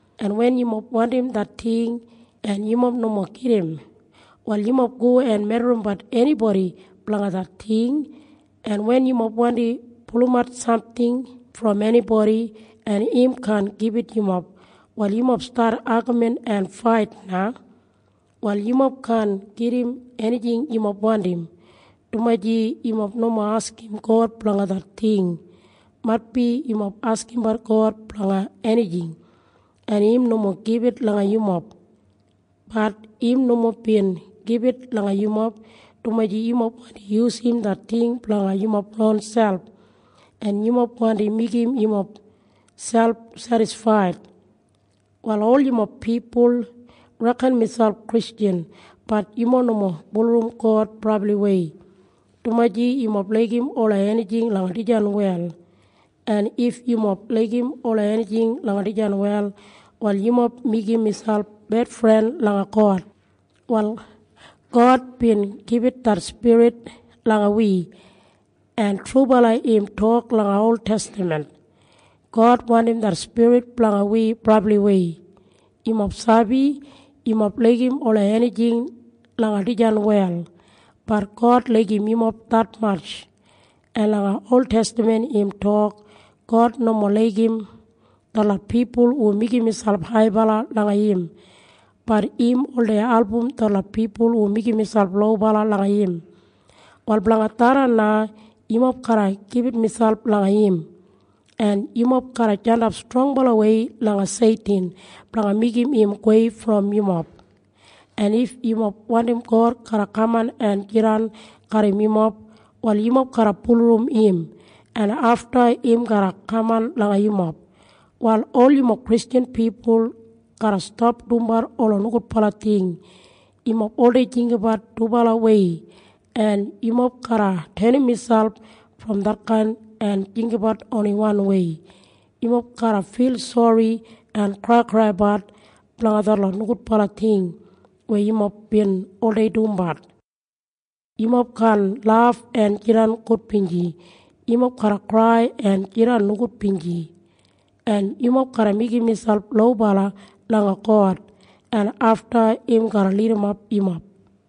En wen yumob wandim det ting en yumob nomo gedim, wal yumob go en medrimbat enibodi blanga det ting. En wen yumob wandi pulumat samting brom enibodi en im kaan gibit yumob, wal yumob stat agamin en fait na. Wal yumob kaan gedim enijing yumob wandim, dumaji yumob nomo askim God blanga det ting. Maitbi yumob askimbat God blanga enijing, en im nomo gibit langa yumob. Bat im nomo bin gibit langa yumob, dumaji yumob wandi yusum det ting blanga yumob ronselp, en yumob wandi meigim yumob selp sedisfaid. Wal ol yumob pipul reken miselp Kristjan. Bat yumob nomo bulurrum God brabliwei, dumaji yumob laigim ola enijing langa dijan wel. En if yumob laigim ola enijing langa dijan wel, wal yumob meigim miselp bedfren langa God. Wal God bin gibit det spirit langa wi, en trubala im tok langa oltestaman, God wandim det spirit blanga wi brabliwei. Yumob sabi? Yumob laigim ola enijing langa dijan wel. Bat God laigim yumob detmatj. En langa oltestaman im tok, “God nomo laigim detlot pipul hu meigim miselp haibala langa im. Bat im oldei album detlot pipul hu meigim miselp lobala langa im.” Wal blanga tharran na, yumob garra gibit miselp langa im, en yumob garra jandap strongbalawei langa Seitin blanga meigim im gowei brom yumob. En if yumob wandim God garra kaman en jidan garram yumob, wal yumob garra bulurrum im, en afta im garra kaman langa yumob. Wal ol yumob Kristjan pipul garra stap dumbat ola nogudbala ting. Yumob oldei jinggabat dubalawei en yumob garra tenim miselp brom detkain en jinggabat oni wanwei. Yumob garra fil sori en kraikraibat blanga detlot nogudbala ting weya yumob bin oldei dumbat. Yumob kaan laf en jidan gudbinji. Yumob garra krai en jidan nogudbinji, en yumob garra meigim miselp lobala langa God, en afta im garra lidimap yumob.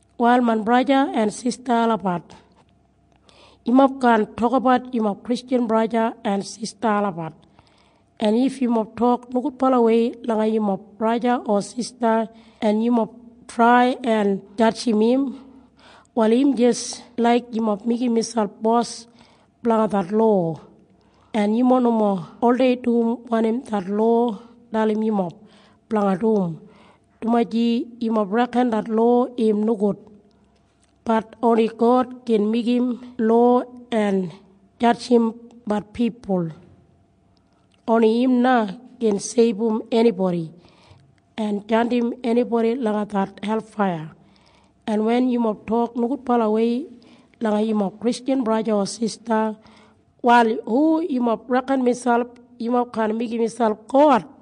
Wal main braja en sista olabat, yumob kaan tokabat yumob Kristjan braja en sista olabat. En if yumob tok nogudbalawei langa yumob braja o sista en yumob trai en jadjim im, wal im jis laik yumob meigim miselp bos blanga det lowa, en yumob nomo oldei dum wanim det lowa dalim yumob blanga dum, dumaji yumob reken det lowa im nogud. Bat oni God gin meigim lowa en jadjimbat pipul. Oni im na gin seibum enibodi en jandim enibodi langa det helfaiya. En wen yumob tok nogudbalawei langa yumob Kristjan braja o sista, wal hu yumob reken miselp? Yumob kaan meigim miselp God.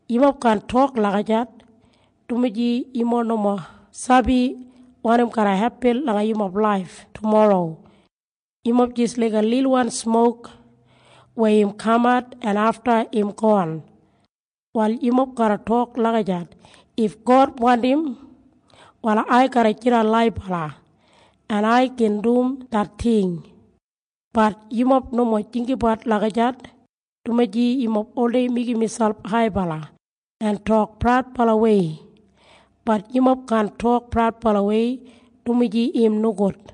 Yumob kaan tok lagijat, dumaji yumob nomo sabi wanim garra hepin langa yumob laif tumorro. Yumob jis laiga lilwan smok weya im kamat en afta im gon. Wal yumob garra tok lagijat, “If God wandim, wal ai garra jidan laibala, en ai gin dum det ting.” Bat yumob nomo jinggabat lagijat, dumaji yumob oldei meigim miselp haibala en tok praudbalawei. Bat yumob kaan tok praudbalawei, dumaji im nogud.